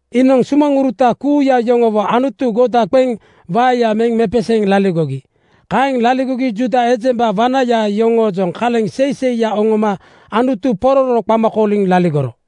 Iinoŋ sumaŋuruta kuuya yoŋowo Anutu goda qeŋ waeya meŋ mepeseeŋ laligogi. Kaeŋ laligogi Juuda ejemba wanaya yoŋoojoŋ kaleŋ seiseiya oŋoma Anutu pororo qama kooliŋ laligoro.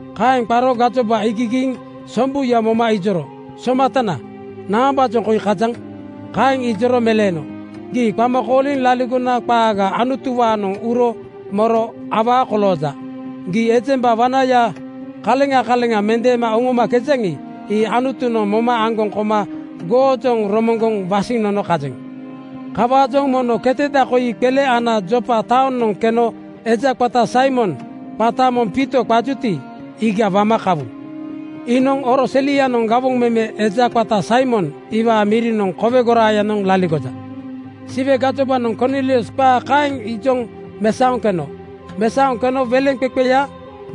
Kaeŋ qaro gajoba iigigiiŋ sombuya moma ijoro, “Somatana, naambaajoŋ koi kajaŋ?” Kaeŋ ijoro meleeno, “Gii qama kooliŋ laligona qaaga Anutuwaanoŋ uro moro awaa kolooja. Gii ejemba wanaya kaleŋa kaleŋa mendeema oŋomakejaŋi, ii Anutunoŋ moma aŋgoŋ koma goojoŋ romoŋgoŋ wasiŋ nono kajeŋ. Kawaajoŋ mono keteda koi qele ana Jopa taonoŋ keno eja qata Saimon, qata moŋ Piito qajuti, iiga wama kawu. Iinoŋ oro selianoŋ gawoŋ meme eja qata Saimon iwaa mirinoŋ kowe goraayanoŋ laligoja.” Siwe gajobanoŋ Kornilius qaa kaeŋ ijoŋ mesaoŋ keno. Mesaoŋ keno weleŋqeqeya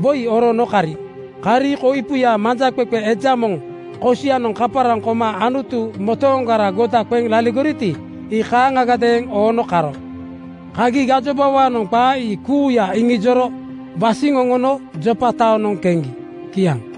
woi oroono kari. Kari koipuya manjaqeqe eja moŋ kosianoŋ kaparaŋ koma Anutu motooŋgara goda qeŋ laligoriti, ii kaaŋagadeeŋ oono karo. Kagi gajobawaanoŋ qaa ii kuuya iŋijoro wasiŋ oŋono Jopa taonoŋ keŋgi. Kiaŋ.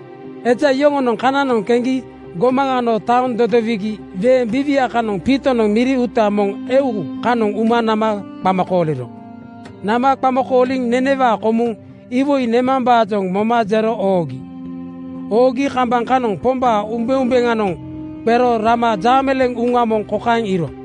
Eja yoŋonoŋ kananoŋ keŋgi gomaŋ ano taoŋ dodowigi weeŋ biiwia kanoŋ Piitonoŋ miri uuta moŋ eu kanoŋ uma nama qama kooliro. Nama qama kooliŋ nenewaa komuŋ iwoi nemambaajoŋ moma jero oogi. Oogi kambaŋ kanoŋ Pombaa umbeumbeŋanoŋ qero rama jaameleeŋ uŋa moŋ kokaeŋ iiro: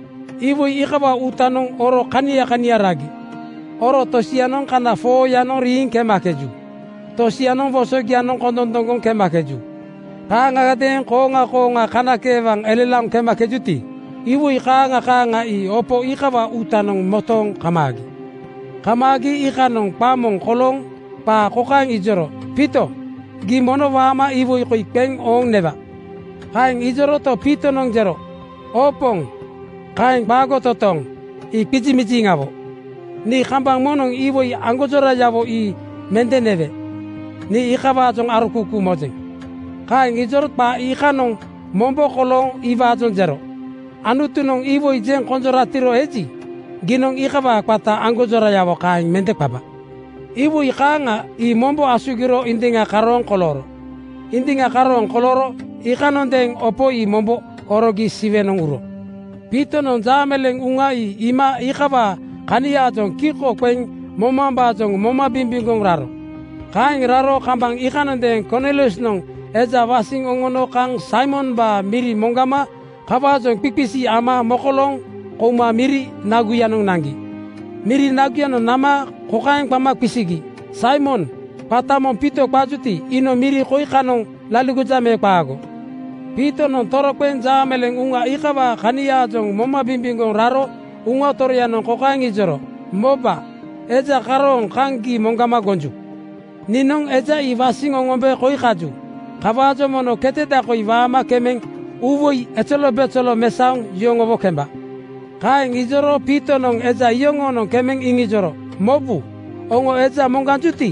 Iwoi iikawaa uutanoŋ oro kania kania ragi. Oro tosianoŋ kana 4:yanoŋ riiŋ kemakeju. Tosianoŋ wosogianoŋ kondondoŋgoŋ kemakeju. Kaaŋagadeeŋ kooŋa kooŋa kanakeewaŋ elelaoŋ kemakejuti, iwoi kaaŋa kaaŋa ii opo iikawaa uutanoŋ motooŋ kamaagi. Kamaagi iikanoŋ qa moŋ kolooŋ qaa kokaeŋ ijoro, “Piito, gii mono waama iwoi koi qeŋ ooŋ newa.” Kaeŋ ijoroto, Piitonoŋ jero, “Oo Poŋ, kaeŋ qaago totooŋ! Ii qizimiziŋawo. Nii kambaŋ moŋnoŋ iwoi aŋgonjorayawo ii mende newe. Nii iikawaajoŋ arokuukuu mojeŋ.” Kaeŋ ijoro qa iikanoŋ mombo kolooŋ iwaajoŋ jero, “Anutunoŋ iwoi jeŋ konjoratiro eji, giinoŋ iikawaa qata aŋgonjorayawo kaeŋ mende qaba.” Iwoi kaaŋa ii mombo asugiro indiŋa karooŋ kolooro. Indiŋa karooŋ kolooro iikanondeeŋ opo ii mombo horogi Siwenoŋ uro. Piitonoŋ jaameleeŋ uŋa ii iima iikawaa kaniaajoŋ kiko qeŋ momambaajoŋ moma bimbimgoŋ raro. Kaeŋ raro kambaŋ iikanondeeŋ Korniliusnoŋ eja wasiŋ oŋono kaŋ Saimombaa miri moŋgama kawaajoŋ qiqisi ama mokolooŋ kouma miri naguyanoŋ naŋgi. Miri naguyanoŋ nama kokaeŋ qama qisigi, “Saimon qata moŋ Piito qajuti, iinoŋ miri koi kanoŋ laligoja me qaago?” Piitonoŋ toroqeŋ jaameleeŋ uŋa iikawaa kaniaajoŋ moma bimbimgoŋ raro Uŋa Toroyanoŋ kokaeŋ ijoro, “Moba, eja karoonoŋ kaŋ gii moŋgama gonju. Niinoŋ eja ii wasiŋ oŋombe koi kaju. Kawaajoŋ mono keteda koi waama kemeŋ uuwoi ezelobezelo mesaoŋ yoŋowo kemba.” Kaeŋ ijoro Piitonoŋ eja iyoŋonoŋ kemeŋ iŋijoro, “Mobu, oŋo eja moŋganjuti,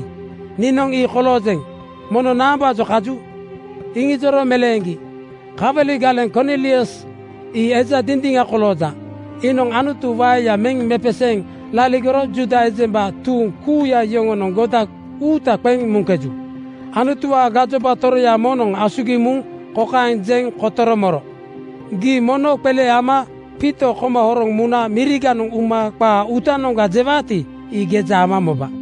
niinoŋ ii koloojeŋ. Mono naambaajoŋ kaju?” Iŋijoro meleeŋgi, “Kawali galeŋ Kornilius ii eja dindiŋa kolooja. Iinoŋ Anutu waeya meŋ mepeseeŋ laligoro Juuda ejemba tuuŋ kuuya yoŋonoŋ goda uuta qeŋ muŋkeju. Anutuwaa gajoba toroya moŋnoŋ asugiŋ muŋ kokaeŋ jeŋ kotoro moro, ‘Gii mono qele ama Piito koma horoŋ muna miriganoŋ uma qaa uutanoŋga jewaati, ii geja ama moba.’”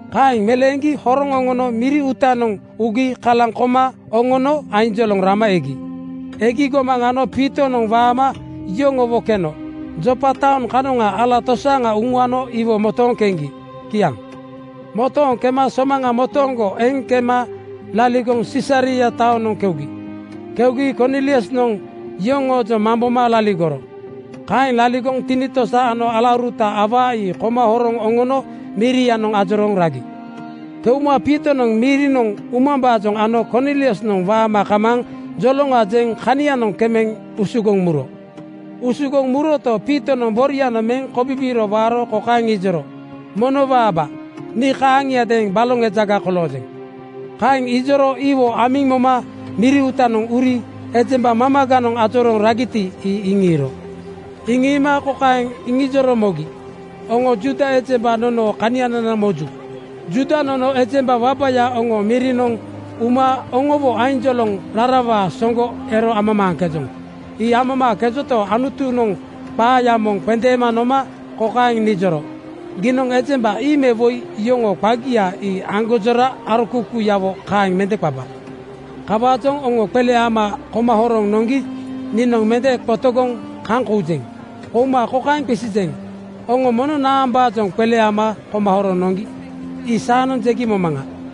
Kaeŋ meleeŋgi horoŋ oŋono miri uutanoŋ ugi kalaŋ koma oŋono ainjoloŋ rama egi. Egi gomaŋ ano Piitonoŋ waama yoŋowo keno. Jopa taoŋ kanoŋa ala tosaaŋa uŋuano iwo motooŋ keŋgi. Kiaŋ. Motooŋ kema somaŋa motooŋgo eŋ kema laligoŋ Sisaria taonoŋ keugi. Keugi Korniliusnoŋ yoŋoojoŋ mamboma laligoro. Kaeŋ laligoŋ tinitosa ano alauruta awaa ii koma horoŋ oŋono mirianoŋ ajorooŋ ragi. Keuma Piitonoŋ mirinoŋ umambaajoŋ ano Korniliusnoŋ waama kamaaŋ joloŋa jeŋ kanianoŋ kemeŋ usugoŋ muro. Usugoŋ muroto, Piitonoŋ borianoŋ meŋ kobibiiro waaro kokaeŋ ijoro, “Mono waaba, nii kaaŋiadeeŋ baloŋ ejaga koloojeŋ.” Kaeŋ ijoro iwo amiŋ moma miri uutanoŋ uri ejemba mamaganoŋ ajorooŋ ragiti, ii iŋiiro. Iŋiima kokaeŋ iŋijoro mogi, “Oŋo Juuda ejemba nonoo kanianana moju. Juuda nono ejemba wabaya oŋoo mirinoŋ uma oŋowo ainjoloŋ rarawaa soŋgo ero amamaaŋkejoŋ. Ii amamaaŋkejonto, Anutunoŋ qaaya moŋ qendeema noma kokaeŋ nijoro, ‘Giinoŋ ejemba ii me woi yoŋoo qagia ii aŋgonjora arokuukuuyawo kaeŋ mende qaba.’ Kawaajoŋ oŋo qele ama koma horoŋ noŋgi niinoŋ mende qotogoŋ kaŋ koujeŋ. Kouma kokaeŋ qisijeŋ: Oŋo mono naambaajoŋ qele ama koma horoŋ noŋgi? Ii saanoŋ jegi momaŋa.”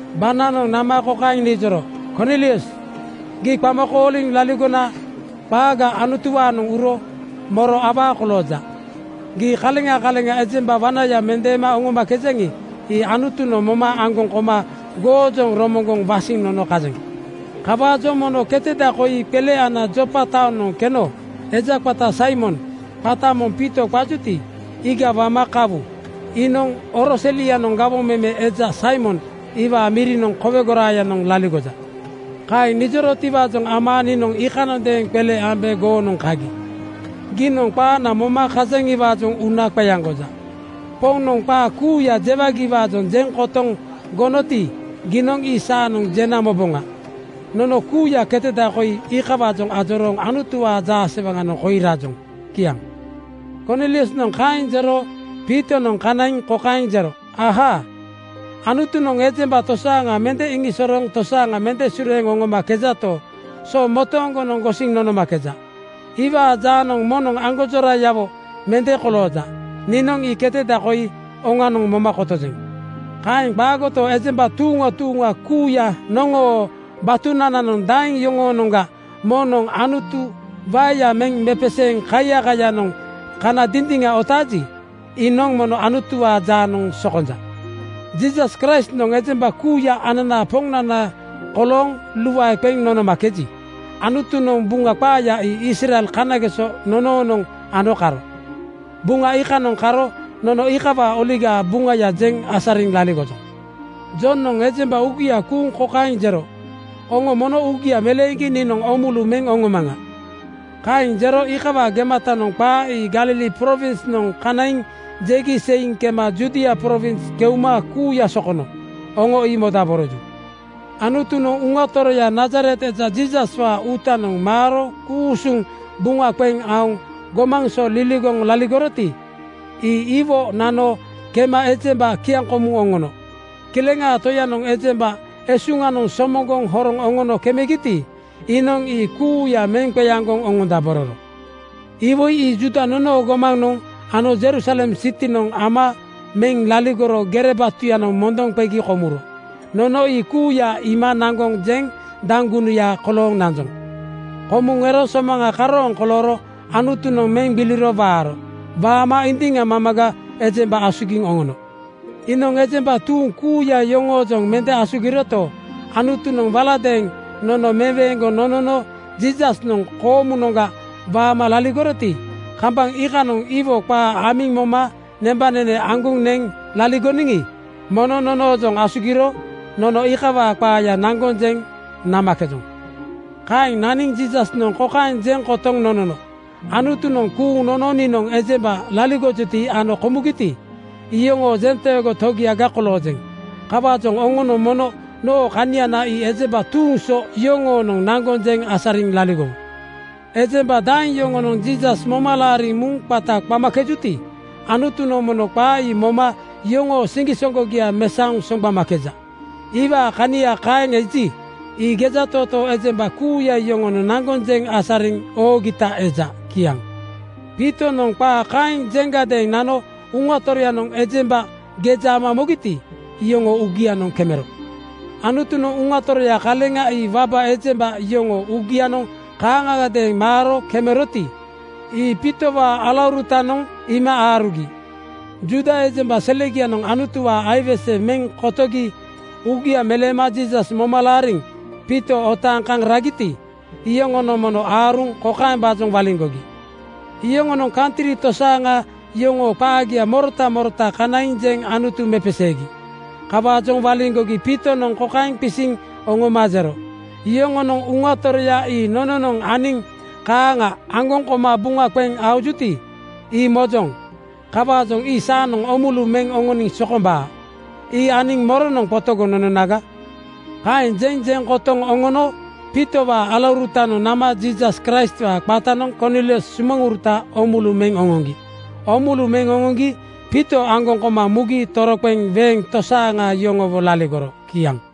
“Bananoŋ nama kokaeŋ nijoro, ‘Kornilius, gii qama kooliŋ laligona qaaga Anutuwaanoŋ uro moro awaa kolooja. Gii kaleŋa kaleŋa ejemba wanaya mendeema oŋomakejaŋi, ii Anutunoŋ moma aŋgoŋ koma goojoŋ romoŋgoŋ wasiŋ nono kajeŋ. Kawaajoŋ mono keteda koi qele ana Jopa taonoŋ keno eja qata Saimon, qata moŋ Piito qajuti, iiga wama kawu. Iinoŋ oro selianoŋ gawoŋ meme eja Saimon iwaa mirinoŋ kowe goraayanoŋ laligoja.’ “Kaeŋ nijorotiwaajoŋ ama niinoŋ iikanondeeŋ qele ambe goonoŋ kagi. Giinoŋ qaana moma kajaŋiwaajoŋ uuna qeaŋgoja. Poŋnoŋ qaa kuuya jewagiwaajoŋ jeŋ kotoŋ gonoti, giinoŋ ii saanoŋ jena moboŋa. Nono kuuya keteda koi iikawaajoŋ ajorooŋ Anutuwaa jaasewaŋanoŋ koi rajoŋ.” Kiaŋ. Korniliusnoŋ kaeŋ jero Piitonoŋ kanaiŋ kokaeŋ jero, “Ahaa! Anutunoŋ ejemba tosaaŋa mende iŋiisosorooŋ tosaaŋa mende sureeŋ oŋomakejato, so motooŋgonoŋ gosiŋ nonomakeja. Iwaa jaanoŋ moŋnoŋ aŋgonjorayawo mende kolooja. Niinoŋ ii keteda koi oŋanoŋ moma kotojeŋ. “Kaeŋ qaagoto, ejemba tuuŋa tuuŋa kuuya noŋoo batunananoŋ daeŋ yoŋoonoŋga moŋnoŋ Anutu waeya meŋ mepeseeŋ kaiyakayanoŋ kana dindiŋa otaaji, iinoŋ mono Anutuwaa jaanoŋ sokonja. Jiisas Kraistnoŋ ejemba kuuya ananaa Poŋnana kolooŋ luae qeŋ nonomakeji, Anutunoŋ Buŋa qaaya ii Israel kanageso nonoonoŋ ano karo. Buŋa iikanoŋ karo nono iikawaa Oligaa Buŋaya jeŋ asariŋ laligojoŋ. Jonoŋ ejemba uugia kuuŋ kokaeŋ jero, ‘Oŋo mono uugia meleeŋgi niinoŋ oomulu meŋ oŋomaŋa.’ Kaeŋ jero kawaa gematanoŋ qaa ii Galili prowinsnoŋ kanaiŋ jegi seiŋ kema Judia prowinsnoŋ keuma kuuya sokono. Oŋo ii modaboroju. “Anutunoŋ Uŋa Toroya Nazaret eja Jiisaswaa uutanoŋ maaro ku-usuŋ buŋa qeŋ aoŋ gomaŋ so liligoŋ laligoroti, ii iwo nano kema ejemba kiaŋkomuŋ oŋono. Kileŋaa Toyanoŋ ejemba esuŋanoŋ somoŋgoŋ horoŋ oŋono kemegiti, iinoŋ ii kuuya meŋ qeaŋgoŋ oŋondabororo. Iwoi ii Juuda nonoo gomanoŋ ano Jerusalem sitinoŋ ama meŋ laligoro gere batuyanoŋ mondoŋ qegi komuro. Nono ii kuuya iima naŋgoŋ jeŋ daŋgunuya kolooŋ nanjoŋ. Komuŋ ero somaŋa karooŋ kolooro Anutunoŋ meŋ gbiliro waaro. Waama indiŋa mamaga ejemba asugiŋ oŋono. “Iinoŋ ejemba tuuŋ kuuya yoŋoojoŋ mende asugiroto, Anutunoŋ waladeeŋ nono meweeŋgoŋ nonono Jiisasnoŋ koomu-noŋga waama laligoroti, kambaŋ iikanoŋ iwo qaa amiŋ moma nembanene aŋgoŋ neŋ laligoniŋi, mono nonoojoŋ asugiro nono iikawaa qaaya naŋgoŋ jeŋ namakejoŋ. Kaeŋ naniŋ Jiisasnoŋ kokaeŋ jeŋ kotoŋ nonono, ‘Anutunoŋ kuuŋ nono niinoŋ ejemba laligojuti ano komugiti, iyoŋoo jenteego Togiaga koloojeŋ. Kawaajoŋ oŋonoŋ mono noo kaniana ii ejemba tuuŋ so yoŋoonoŋ naŋgoŋ jeŋ asariŋ laligowu.’ Ejemba daeŋ yoŋonoŋ Jiisas moma laariŋ muŋ qata qamakejuti, Anutunoŋ mono qa ii moma yoŋoo siŋgisoŋgogia mesaoŋ soŋgbamakeja. Iwaa kania kaeŋ eji, ii gejatootoo ejemba kuuya yoŋonoŋ naŋgoŋ jeŋ asariŋ oogita eja.” Kiaŋ Piitonoŋ qaa kaeŋ jeŋgadeeŋ nano Uŋa Toroyanoŋ ejemba geja ama mogiti, iyoŋoo uugianoŋ kemero. Anutunoŋ Uŋa Toroya kaleŋa ii waba ejemba yoŋoo uugianoŋ kaaŋagadeeŋ maaro kemeroti, ii Piitowaa alaurutanoŋ iima aarugi. Juuda ejemba selegianoŋ Anutuwaa aiwese meŋ kotogi uugia meleema Jiisas moma laariŋ Piito otaaŋ kaŋ ragiti, iyoŋonoŋ mono aaruŋ kokaembaajoŋ waliŋgogi: Yoŋonoŋ kantri tosaaŋa yoŋoo qaagia morota morota kanaiŋ jeŋ Anutu mepeseegi. Kawaajoŋ waliŋgogi Piitonoŋ kokaeŋ qisiŋ oŋoma jero, “Yoŋonoŋ Uŋa Toroya ii nononoŋ aniŋ kaaŋa aŋgoŋ koma buŋa qeŋ aojuti, ii mojoŋ. Kawaajoŋ ii saanoŋ oomulu meŋ oŋoniŋ sokombaa. Ii aniŋ moronoŋ qotogoŋ nononaga?” Kaeŋ jeŋ jeŋ kotoŋ oŋono Piitowaa alaurutanoŋ nama Jiisas Kraistwaa qatanoŋ Kornilius sumaŋuruta oomulu meŋ oŋoŋgi. Oomulu meŋ oŋoŋgi Piito aŋgoŋ koma mugi toroqeŋ weeŋ tosaaŋa yoŋowo laligoro. Kiaŋ.